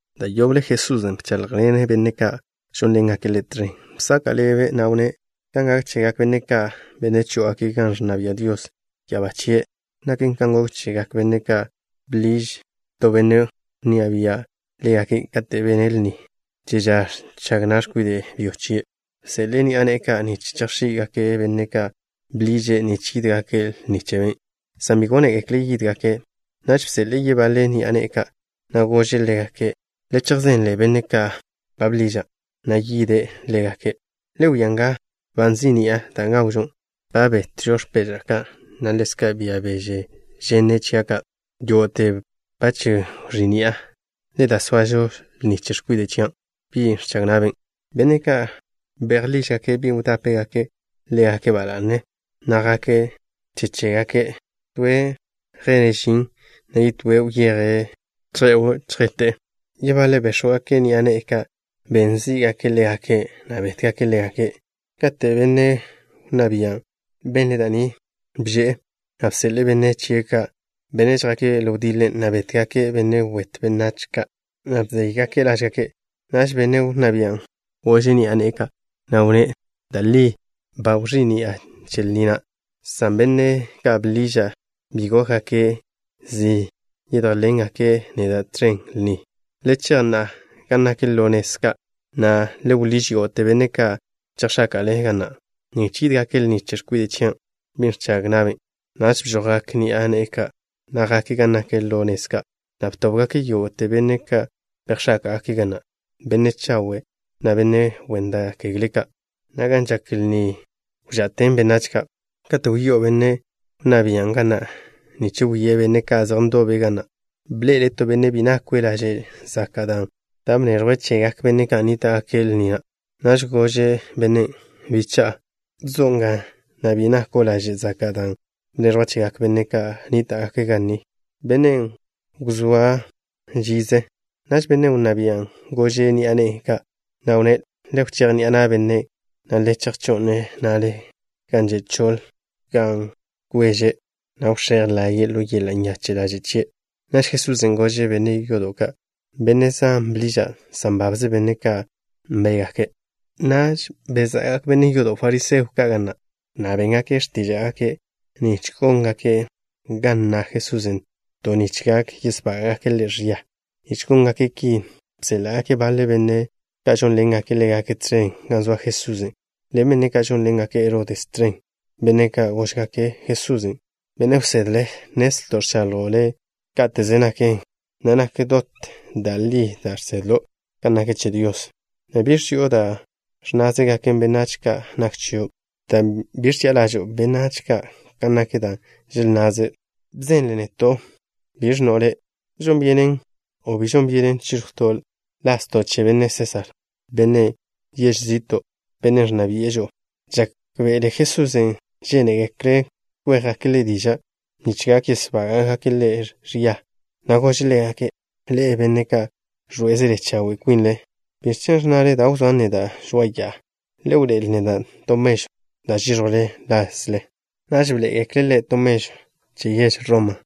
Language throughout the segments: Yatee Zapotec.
Da' yoble Jesusen' bcháḻjḻene' benne' ka' žónḻengake' Ḻe' tẕen. Bsaka' ḻebe', na' wnné': —Kan gak chegak benne' ka', benne' chó'ogake' gan ẕnna bia' Dios ya'abá chie', naken kan gok chegak benne' ka', bḻiž to benne' wnná bia' ḻégake' kate' bene' lni che ža ẕchag na' x̱kwide' byo chie'. Bseḻe'e ni'a ne'e ka' nich chejx̱í'gake' benne' ka' ba bḻiže' nich yídgake' lni chebe', san bi gónegekle' yídgake'. Naž bseḻe'e yebaḻe ni'a ne'e ka', na' gože' ḻégake': “Le chejzenle benne' ka' ba bḻiža', na' ye'le ḻégake': Le wia nga, ba nzí'ni'a da' gawžo. Ba betto' x̱peža' ka', na' ḻezka' bia beže ženne' chia' ka'. Yógo'te ba wẕí'ni'a. Le da, soažo lni che x̱kwide' chia', bin' ẕchag na'be'.” Benne' ka' bejḻížgake' bi wdápegake' ḻégake' ba la'ne, na' jake' che chégake'. Toe' yjene' žin, na' yetóe' wyeje' chje'w chjete'. Yebaḻe' béx̱wgake' ni'a ne'e ka', na' ben zí'gake' ḻégake', na' bétgake' ḻégake'. Kate' benne' wnná bian' benle' da' ni, bže'e, na' bseḻe'e benne' chie' ka', benne' žjake' ḻo wdiḻe, na' bétgake' benne' wet benách ka', na' bzéygake' lážgake'. Naž benne' wnná bian' gože' ni'a ne'e ka', na' wnné': “Da' li ba wẕí'ni'a che lni na', san benne' ka' bḻiža' bi gókgake' zi yedjénḻengake' neda' tẕen lni. Le chej na'a gan nak ḻo nez ka', na' le wḻíž yógo'te benne' ka' chejx̱áka'le ga na' nich yídgake' lni che x̱kwide' chia', bin' ẕchag na'be'.” Naž bžojgak ni'a ne'e ka', na' jake' gan nak ḻo nez ka', na' btóbgake' yógo'te benne' ka' bejx̱áka'gake' ga na', benne' chawe' ka' na' benne' wen da' kegle ka', na' gan žak lni wža'ten benách ka'. ’Kate' wyó'o benne' wnná bian' ga na' nich wie' benne' ka' zej ndobe' ga na', bḻe'ele' to benne' bi nakwe' laže' zaka' dan' bneẕjwe' chegak benne' ka' nníta'gake' lni na'. Naž gože' bennen': “Bicha'a, ¿zo' nga, na' bi nako' laže' zaka' dan' bneẕjwa' chegak benne' ka' nníta'gake' lni?” Bennen' wzóa žize'. Naž benne' wnná bian' gože' ni'a ne'e ka', na' wnné': “Le wchéj ni'a na' bennen', na' le chejžó'n-ne' na'le gan že' choḻ, gan kweže', na' wx̱éj laye'e ḻo yeḻa' nyache' ḻaže' chie'.” Naž Jesusen' gože' benne' yodo' ka': —Benne' zan bḻiža', san babze benne' ka' nbégake'. Naž beza'gak benne' yodo' fariseo ka' ga na', na' béngake' x̱tíža'gake' nich góngake' ga nna Jesusen' to nich gak yesbága'gake' Ḻe' ẕia. Nich góngake' ki bséḻa'gake' baḻe benne' ka' žónḻengake' ḻégake' tẕen gan zoa Jesusen', ḻen benne' ka' žónḻengake' Herodes tẕen. Benne' ka' góžgake' Jesusen': —Benne' wsedle, nnezlto' ẕchaḻjo' Le' káteze naken, na' nak dot da' li da' žsedlo' kan naken che Dios, na' bi ẕzi'o da' ẕnnázegak benách kan nak chio', dan' bi ẕchi'a ḻažo'o benách ka' kan nak da' želnnaze'. Bzenle neto'. ¿Biẕ ẕnno' le'? ¿Žon byenen o bi žon byenen chíẕjwto' lazto' che benne' Sésar, bennen' yež zi'to', bennen' ẕnna bi'e žo'o? Žákbe'ele Jesusen' žénegekle' kwéjgake' Ḻe' diža', nich gak yesbága'gake' Ḻe' ẕia, na' gože' ḻégake': —Ḻe'e, benne' ka' ẕḻoé'ezele chawe' kwinle, ¿biẕ chen' ẕnnale da' wzóan neda' žoa'a ya'a? Le wḻoé'el neda' to mežw da' žíẕjwle lazle. Naž bḻoé'egekle' Ḻe' to mežw che yež Roma.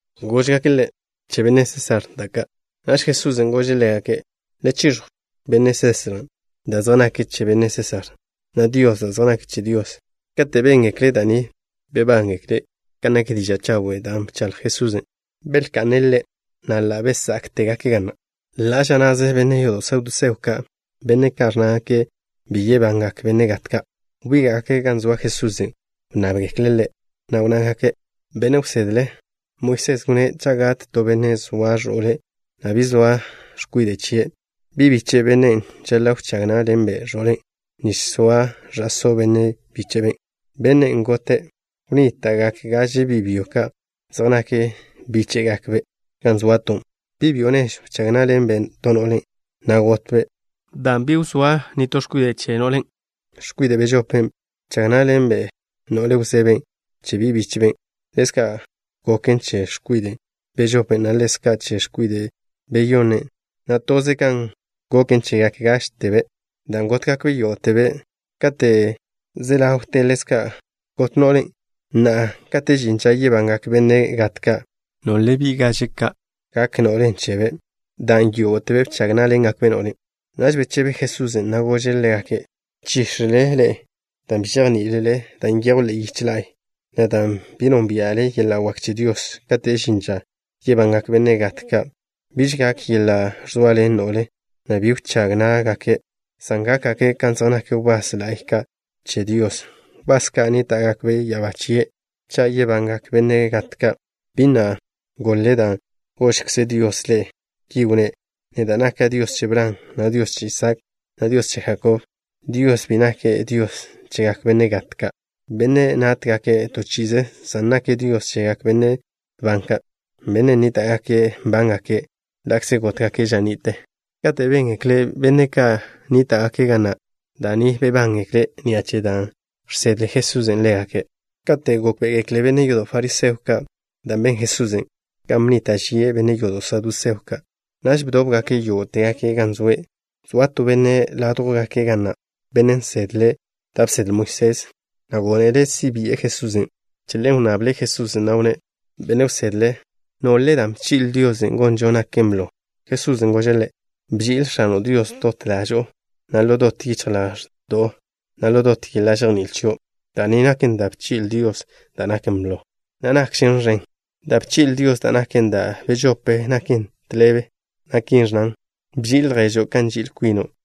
Góžgake' Ḻe': —Che benne' Sésar da' ka'. Naž Jesusen' gože' ḻégake': —Le chiẕjw benne' Sésar da' zej naken che benne' Sésar, na' Dios da' zej naken che Dios. Kate' béngekle' da' ni, bebángekle' kan nak diža' chawen' da' bchaḻj Jesusen'. Belka'ne' Ḻe', na' ḻa' bezá'tegake' ga na'. Ḻa' ža na'ze benne' yodo' saduseo ka', benne' ka' ẕnnágake' bi yebangak benne' gat ka', wbíga'gake' gan zoa Jesusen'. Wnnábgekle' Ḻe', na' wnnágake': —Benne' wsedle, Moisés wnné': “Cha' gat to benne' zoa ẕo'le, na' bi zoa no x̱kwide' chie', bi' biche' bennen' žaḻa' wchág ná'ḻenbe' ẕo'le', nich soa ẕa'só benne' bíche'ben', bennen' gote'.” Wnníta'gak gaže bi' byo ka' zej nak bíche'gakbe' gan zoato'. Bi' byo nežw bchag ná'ḻenbe' to no'le, na' gotbe'. Dan' bi wzóa no x̱kwide' chebe', x̱kwide' bežopen' bchag ná'ḻenbe' no'le wzeben' che bi' bíche'ben'. Ḻezka' goken che x̱kwide' bežopen', na' ḻezka' che x̱kwide' beyonnen', na' toze kan goken chegak gážtebe', dan' gótgakbe' yógo'tebe'. Kate' ze ḻawte ḻezka' got no'len'. Na'a, kate' žin ža yebangak benne' gat ka', ¿nole bi' gaže ka' gak no'len' chebe', dan' yógo'tebe' bchag ná'ḻengakbe' no'len'? Naž bechebe Jesusen', na' gože' ḻégake': —Nchíx̱ele ḻe'e dan' bi žejní'ilele da' nyejw ḻe'e yiche la'y, na' dan' bi nónbia'le yeḻa' wak che Dios. Kate' žin ža yebangak benne' gat ka', biž gak yeḻa' ẕzoaḻen no'le, na' bi wchág ná'gake', san gákgake' kan zej nak wbás la'y ka' che Dios, wbás ka' nníta'gake' ya'abá chie'. Cha' yebangak benne' gat ka', ¿bi na' goḻ-le dan' gožkze Dios ḻe'e? Ki wnné': “Neda' naka' Dios che Bran, na' Dios che Isaak, na' Dios che Jakob.” Dios bi nake' Dios chegak benne' gat ka', benne' nátgake' to chi'ize, san nake' Dios chegak benne' ban ka', benne' nníta'gake' nbángake' ḻa'kze gótgake' ža ni'te. Kate' béngekle benne' ka' nníta'gake' ga na' da' ni, bebángekle' ni'a che dan' žsedle Jesusen' ḻégake'. Kate' gókbe'egekle benne' yodo' fariseo ka' da' ben Jesusen', kan bnnita' žie' benne' yodo' saduseo ka', naž bdóbgake' yógo'tegake' gan zoe'. Zoa to benne' ládjwgake' ga na', benne' nsedle' da' bsedle Moisés, na' gónele' si' bi'e Jesusen'. Che ḻen wnnable' Jesusen', na' wnné': —Benne' wsedle, ¿biẕle dan' bchi'le Dios gonžo naken blo? Jesusen' gože' ḻe': —Bži'il X̱ano' Dios dot ḻažo'o, na' ḻo dot yichj ḻaẕdo'o, na' ḻo dot yeḻa' žejní'il chio'. Da' ni naken da' bchi'le Dios da' naken blo, na' nakžen ẕen. Da' bchi'le Dios da' naken da' bežope, naken tḻebe, na' ki ẕnnan: “Bži'il lježo' kan nži'il kwino'.”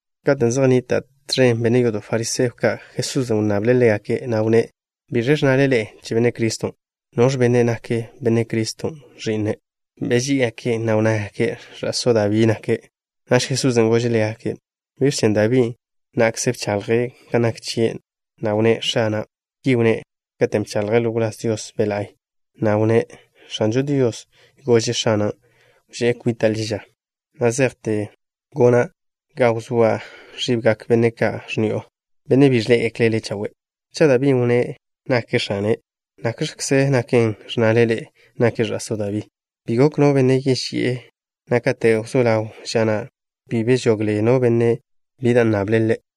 Katen' zej nnita' tẕen benne' yodo' fariseo ka', Jesusen' wnnable' ḻégake', na' wnné': —¿Biẕ ẕnnale ḻe'e che Benne' Criston'? ¿Noẕ benne' nak Benne' Criston' ẕi'ne'? Beží'igake', na' wnnágake': —Ẕa'só Dabí nake'. Naž Jesusen' gože' ḻégake': —¿Biẕ chen' Dabí na'kze bchaḻje' kan nak chie', na' wnné': “X̱ana'?” Ki wnné' katen' bchaḻje' ḻo wláz Dios Be' La'y, na' wnné': X̱anžo Dios gože' X̱ana': “Wžé' kwita' ḻi ža, na zejte gona' ga wzóa ẕibgak benne' ka' x̱ni'o, benne' bi ẕḻé'egekle' Le' chawe'.” Cha' Dabín' wnné' nake' X̱ane', ¿nakx̱kze naken, ẕnnale ḻe'e nake' ẕa'só Dabín'? Bi gok no benne' yeži'e, na' kate' wzó ḻaw ža na', bi bežogle no benne' bi da' nnable' Ḻe'.